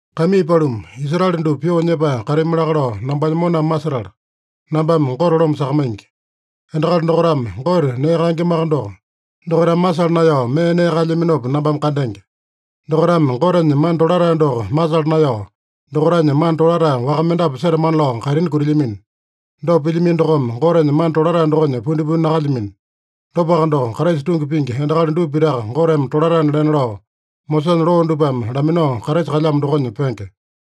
Kaimii paluma, Israele dupa pyoo nyepae katami laka lao nambanya moname masetala, nambame Gote loma sakamaingi. Endakali dokaitame Gote nee kaengemaka doko, dokaitame masala naeyao mee nee kaelyaminopa nambame kandenge. Dokaitame Gotenya mana tolatae doko masala naeyao, dokaitanya mana tolatae waka mendapu setamana lao kaitini kutilyamino. Dopa pilyamino dokome, Gotenya mana tolatae dokonya pundipundi nakalyamino. Dopaka doko, Kraisa tungi pingi endakali dupa pitaka Goteme tolataena lena lao, Mosesanya loo dupame laminao Kraisa kalyamo dokonya penge.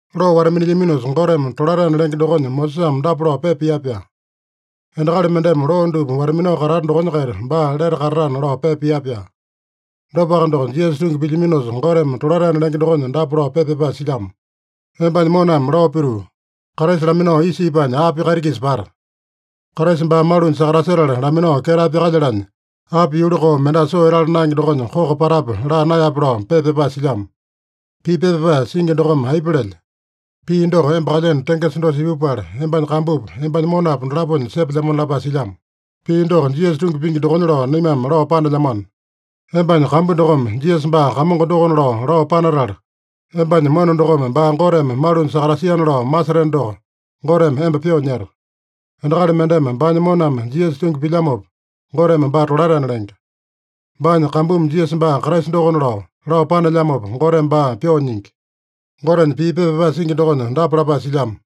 Loo wata-minilyaminosa Goteme tolataena lenge dokonya Mosesame dapa lao pepa pia-pyaa: “Endakali mendeme loo dupa wata-minao katata dokonya-kaita baa lete katatana” lao pepa pia-pyaa. Dopaka doko, Jisasa tungi pilyaminosa Goteme tolataena lenge dokonya dapa lao pepa pyapae silyamo: “Embanya moname lao pituu, ‘Kraisa laminao isa ipanya api kaiti-kisa pata? Kraisa baa malunya sakatasetala laminao ketae pyakalyanya api yuli koo, mendasa soo etala naenge dokonya koko patape?’ laa naeyape” lao pepa pyapae silyamo. Pii pepa pyapae singi dokome aipa lelya? “Pii doko emba kalyeno tengesa dosa ipupala, embanya kambupa, embanya monapa dolaponya sepelyamona” lapae silyamo. Pii doko Jisasa tungi pingi dokonya lao naimame lao panelyamano. Embanya kambu dokome, “Jisasa baa Kamongo dokona” lao, lao panatala, embanya mona dokome baa Goteme malunya sakatasiana lao maseteno doko, Goteme emba pyoo nyeta. Endakali mendeme baanya moname Jisasa tungi pilyamopa, Goteme baa tolataena lenge. Baanya kambumi Jisasa baa Kraisa dokona lao, lao panelyamopa, Goteme baa pyoo nyingi. Gotenya pii pepa pyapae singi dokonya dapa lapae silyamo: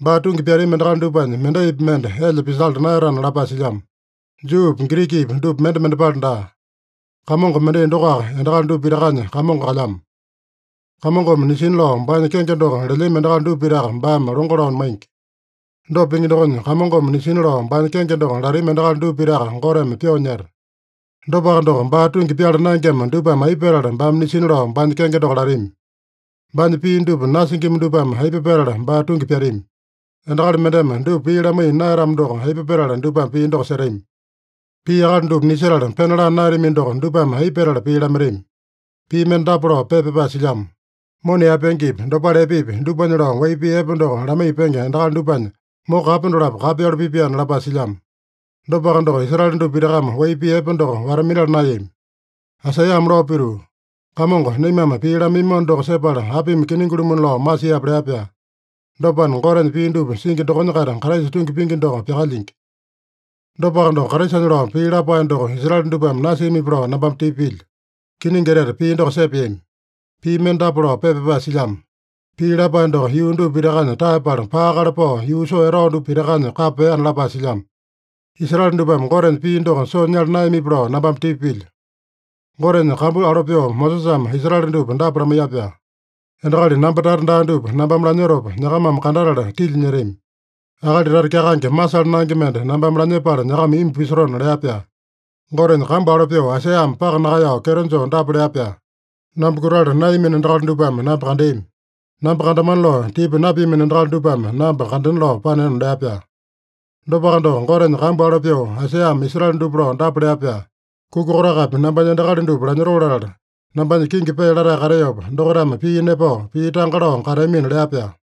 “Baa tungi pyatami endakali dupanya mendaipi mende elya pisala naeyatana” lapae silyamo. Juupi, Girikipi dupa mende mendepale daa. Kamongo mendai dokoaka endakali dupa pitakanya Kamongo kalyamo. Kamongome nisina lao baanya kenge doko lelyami endakali dupa pitaka baame longo lao maingi. Dopa pingi dokonya, “Kamongome nisina lao baanya kenge doko latami endakali dupa pitaka Goteme pyoo nyeta.” Dopaka doko, baa tungi pyala naengema dupame aipa petala baame nisina lao baanya kenge doko latami? Baanya pii dupa nasingima dupame aipa petala baa tungi pyatami? Endakali mendeme dupa pii lamaiya naeyatamo doko, aipa petala dupame pii doko setami? Pii akali dupa nisetala pena laa naeyatamino doko, dupame aipa petala pii lamaitami? Pii mende dapa lao pepa pyapae silyamo: “Mona yaepengepi, dopale epepi, dupanya lao wai pii epe doko lamaiya penge endakali dupanya moko kape dolapo kapeyalu pipaena” lapae silyamo. Dopaka doko, Israele dupa pitakame wai pii epe doko wata-minala naeyami. Aisaiyame lao pituu, “Kamongo, naimame pii lamaiyamano doko sepala apimi kiningi-lumuna lao masiape?” lea-pyaa. Dopana, Gotenya pii dupa singi dokonya-kaita Kraisa tungi pingi doko pyakalyingi. Dopaka doko, Kraisanya lao pii lapae doko Israele dupame nasiamipi lao nambame tipa pilyo. Kiningi etete, pii doko sepeami! Pii mende dapa lao pepa pyapae silyamo: “Pii lapae doko yuu dupa pitakanya taeyapala, paakale pao yuu soo etao dupa pitakanya kapa peana” lapae silyamo. Israele dupame Gotenya pii doko soo nyala naeyamipi lao nambame tipa pilyo. Gotenya kambu alo pyoo Mosesame Israele dupa dapa lamaiya-pyaa: “Endakali namba tata daa dupa nambame lanyotopa, nyakamame kandatala tilya nyetami. Akali tata kyakaenge masala naenge mende nambame lanyepala nyakama imbu pisotona” lea-pyaa. Gotenya kambu alo pyoo, Aisaiyame paka nakaeyao kyeto joo dapa lea-pyaa: “Namba kutala naeyamino endakali dupame namba kandeami. Namba kandamana lao tipa napiamino endakali dupame namba kandena lao paneona” lea-pyaa. Dopaka doko, Gotenya kambu alo pyoo, Aisaiyame Israele dupa lao dapa lea-pyaa: “Kuka kotakapi nambanya endakali dupa lanyotoo latala, nambanya kingi pee latae kateopa, dokaitame pii nepao, pii tanga lao kateamina” lea-pyaa.